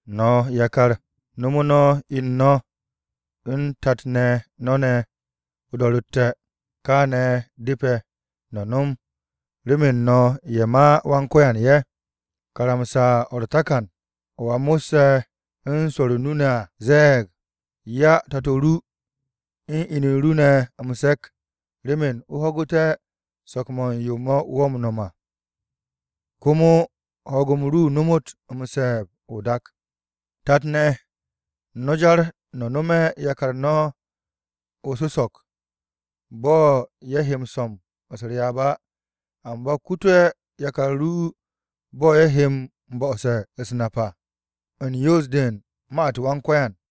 No̱ yakar no̱me̱ no̱ inu no̱ u̱n tat-ne̱ no̱ ne̱ o-do̱ro̱tte̱. Kaane̱ depe̱ no̱ no̱m remen no̱ ye̱ ma Wan-Ko̱yan ye̱. Karamsa-o̱ u̱r-takan o̱ a mo̱sse̱ u̱n swo̱o̱ru̱ o-nu ne̱ à ze̱e̱g, “'Ya tato ru, u̱n inu ru ne̱ m-se̱k, remen o ho̱gu̱té̱ so̱k-mo̱ u̱n yo wo̱ m-no̱m à, komo ho̱o̱g-m ru no̱mu̱t m-se̱e̱b o-dak.” Tat-ne̱, no̱ jar no̱ no̱me̱ yakar no̱ o-su̱so̱k bo̱ ye̱ he no̱m u̱s-ryaab á. Amba kute̱ yakar ru bo̱ ye̱ he m-bo̱'o̱se̱ u̱s-nap à, u̱n yoos-de u̱n ma-u̱t Wan-Ko̱yan.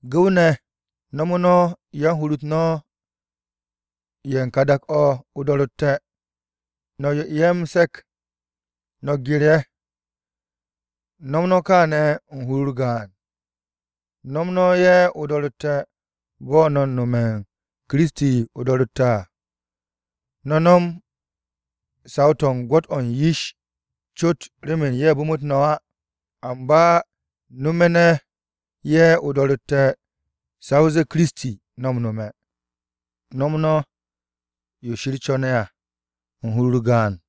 Gu̱w-ne̱, no̱me̱ no̱ yan-hur-u̱t no̱ ye̱ u̱n ka dak-o̱ o-do̱ro̱tte̱, no̱ 'ye ye̱ m-se̱k, no̱ gye̱r ye̱. No̱m no̱ kaane̱ u̱n hur-u̱r gaan. No̱m no̱ ye̱ o-do̱ro̱tte̱, bo̱ no̱ u̱n no̱me̱ u̱n Kiristi o-do̱ro̱tte̱ à. No̱ no̱m saw-to̱ u̱n gwo̱t-o̱ u̱n yish cot remen ye̱ bu̱mu̱t no̱ á. Amba no̱me̱ no̱ ye̱ o-do̱ro̱tte̱ sa o zee Kiristi, no̱ m-nome̱, no̱m no̱ yo Shir co̱ne̱ à u̱n hur-u̱r gaan.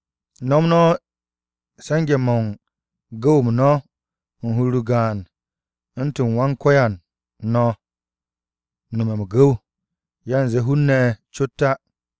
No̱m no̱ se̱nge̱-mo̱ u̱n gu̱w-m no̱ u̱n hur-u̱r gaan, u̱ntu̱n Wan-Ko̱yan no̱ m-no̱me̱ m-gu̱w, yanze hun-ne̱ cot á.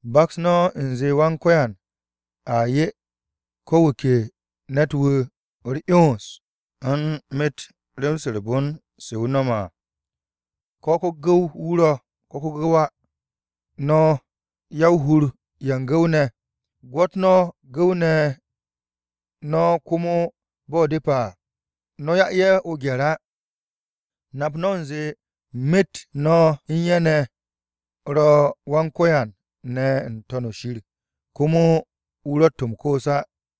Baks no̱ u̱nze Wan-Ko̱yan a 'ye ko̱ wu̱ ke ne̱t-wu̱ u̱r-'yons u̱n myet rem-se u̱r-bon se wu̱ no̱me̱ à, ko̱ ko-gu̱w-wu̱ ro̱ ko̱ ko-gu̱w á. No̱ ya-o-hur-ye̱ u̱n gu̱w-ne̱, gwo̱t no̱ gu̱w-ne̱ no̱ komo bo̱ depe̱ à. No̱ 'ya ye̱ o-gye̱r á. Nap no̱ u̱nze myet no̱ u̱n ye̱ ne̱ ro̱ u̱n Wan-Ko̱yan ne̱ n-To̱n o-shir, komo wu̱ ro̱tt m-koos á.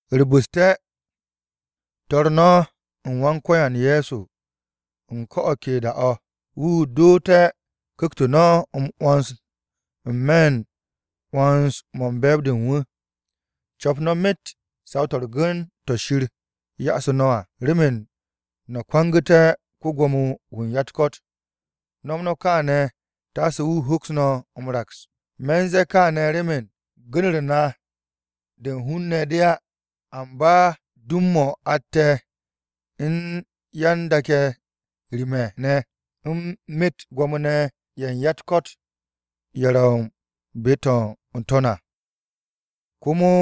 U̱r-bu̱ste̱, to̱r no̱ u̱n Wan-Ko̱yan Ye̱so u̱n ko̱ o̱ ke da-o̱, wu̱ doote̱ ku̱kt-o no̱ m-'wo̱ns n-me̱ 'wo̱ns-mo̱ u̱n be̱e̱b-de u̱n wu̱. Co̱p no̱ myet saw-to̱ u̱r-gu̱n to̱ Shir ya'asu̱ no̱ à, remen no̱ kwangu̱té̱ ko-Gwo̱mo-wu̱ u̱n ya-u̱t-ko̱t. No̱m no̱ kaane̱ taase wu̱ hoks no̱ m-raks. Me̱ u̱n ze̱e̱ kaane̱ remen gu̱n-u̱r na de u̱n hun-ne̱ de á. Amba dum-mo̱ atte̱ u̱n yan-dak-ye̱ rim-ye̱ ne̱ u̱n myet gwo̱mo-ne̱ ye̱ u̱n ya-u̱t-ko̱t ye̱ ro̱ be-to̱ ro̱ n-to̱n à. Komo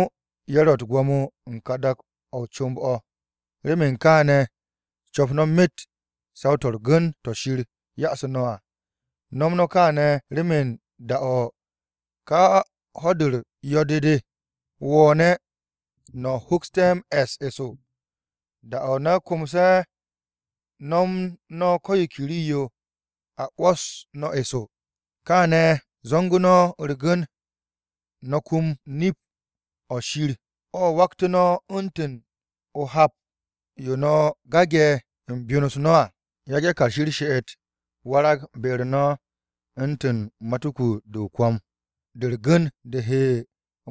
ye̱ ro̱ u̱t-gwo̱mo u̱n ka dak-o̱ o-comb o̱. Remen kaane̱, co̱p no̱ myet saw-to̱ u̱r-gu̱n to̱ Shir ya'asu̱ no̱ à. No̱m no̱ kaane̱ remen da-o̱ ka ho̱-u̱r yo̱-de de wo̱o̱ne̱ no̱ hoksté̱ m-e̱s eso. Da-o̱ no̱ komse̱ no̱m no̱ ko̱ yo ke rii-yo, a 'wo̱s no̱ eso. Kááne̱ zo̱ngu̱ no̱ u̱r-gu̱n! No̱ kum nip-o̱ Shir o̱ waktu̱ no̱ u̱ntu̱n o-hap yo no̱ gage̱ u̱n byon-u̱s no̱ à. Yage̱ kashi u̱r-she'et warag be-u̱r no̱ u̱ntu̱n matuku-de o-kwo̱m de u̱r-gu̱n de he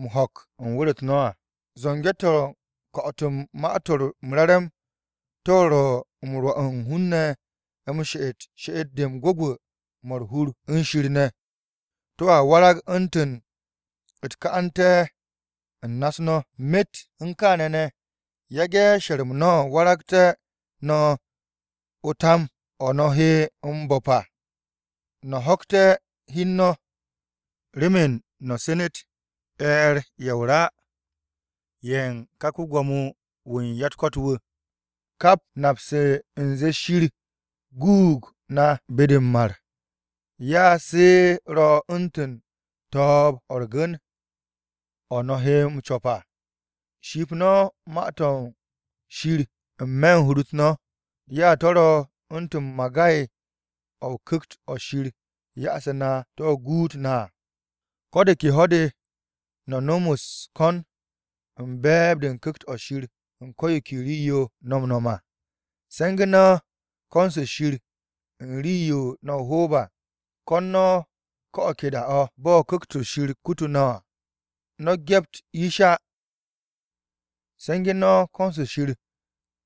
m-ho̱k u̱n wu̱r-u̱t no̱ à. Zo̱nge̱-to̱ u̱n ko̱'o̱t u̱n Ma-to̱ m-Re̱re̱m, to̱ ro̱ m-rwo̱ u̱n hun-ne̱ m-she'et she'et-de u̱n gwu̱gwu̱-mo̱ u̱r-hur u̱n Shir ne̱. To̱a warag u̱ntu̱n u̱t-ka'ante̱ u̱n na-u̱s no̱. Myet u̱n kaane̱ ne̱, yage̱ she̱r-mo̱ waragtu̱ no̱ o-tum o̱ no̱ he m-bo̱p à, no̱ ho̱kte̱ hi u̱n no̱, remen no̱ senet e̱e̱r-ye̱ o-ra ye̱ u̱n ka ko-Gwo̱mo-wu̱ u̱n ya-u̱t-ko̱t wu̱. Ka nap-se u̱nze Shir guug na be-de m-mar, ya se ro̱ u̱ntu̱n to̱o̱b-o̱ u̱r-gu̱n, o̱ no̱ he m-co̱p à. Ship no̱ Ma-to̱ Shir n-me̱ hur-u̱t no̱. Ya to̱ ro̱ u̱ntu̱n magay-o̱ Ku̱kt-o̱ Shir ya'asu̱ na to̱ guut na à. Ko̱ de ke ho̱-de no̱ no̱m u̱s-ko̱n u̱n be̱e̱b-de u̱n Ku̱kt-o̱ Shir u̱n ko̱ yo ke rii-yo no̱ m-no̱m à. Se̱ngu̱ no̱ ko̱n-se Shir u̱n rii-yo no̱ o-hoob à. Ko̱n no̱ ko̱ o̱ ke da-o̱, bo̱ Ku̱kt-o̱ Shir kutu no̱ à. No̱ gyept yish á, se̱nge̱ no̱ ko̱n-se Shir remen hun-ne̱ ye̱ Shir myet.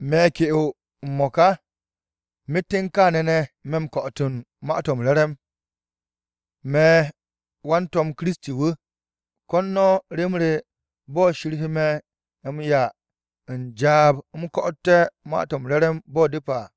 Me̱ ke'o m-mo̱ka, myet u̱n kaane̱ ne̱ me̱ m-ko̱'o̱t u̱n Ma-to̱ m-Re̱re̱m, me̱ wan-to̱m Kiristi wu̱. Ko̱n no̱ rem re bo̱ Shir he me̱ m-'ya u̱n jaab u̱m ko̱'o̱té̱ Ma-to̱ m-Re̱re̱m, bo̱ depe̱ à.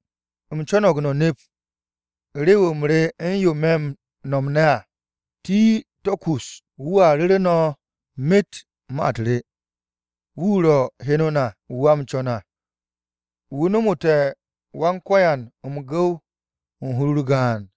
U̱m co̱no̱g no̱ nep rew-m re u̱n yo me̱ m-no̱m ne̱ à. Tiko̱ko̱s, wu̱a ru̱ru̱ no̱ myet ma-u̱t re. Wu̱ ro̱ heno na wu̱ a m-co̱n à. Wu̱ nomote̱ Wan-Ko̱yan m-gu̱w u̱n hur-u̱r gaan.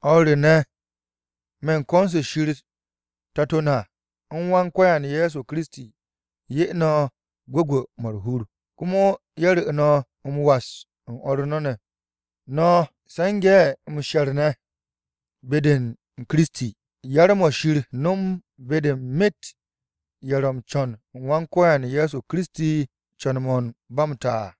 O̱r re ne̱, me̱ u̱n ko̱n-se Shir Tato na u̱n Wan-Ko̱yan Ye̱so Kiristi ne̱, ye̱ 'ye no̱ gwu̱gwu̱-mo̱ u̱r-hur. Komo ye̱ ru̱ no̱ m-was u̱n o̱r no̱ ne̱, no̱ se̱nge̱ m-she̱r ne̱, be-u̱r Kiristi. Yar-mo̱ Shir nom be-de u̱n myet ye̱ ro̱ m-co̱n u̱n Wan-Ko̱yan Ye̱so Kiristi co̱n-mo̱ u̱n ba m-ta à.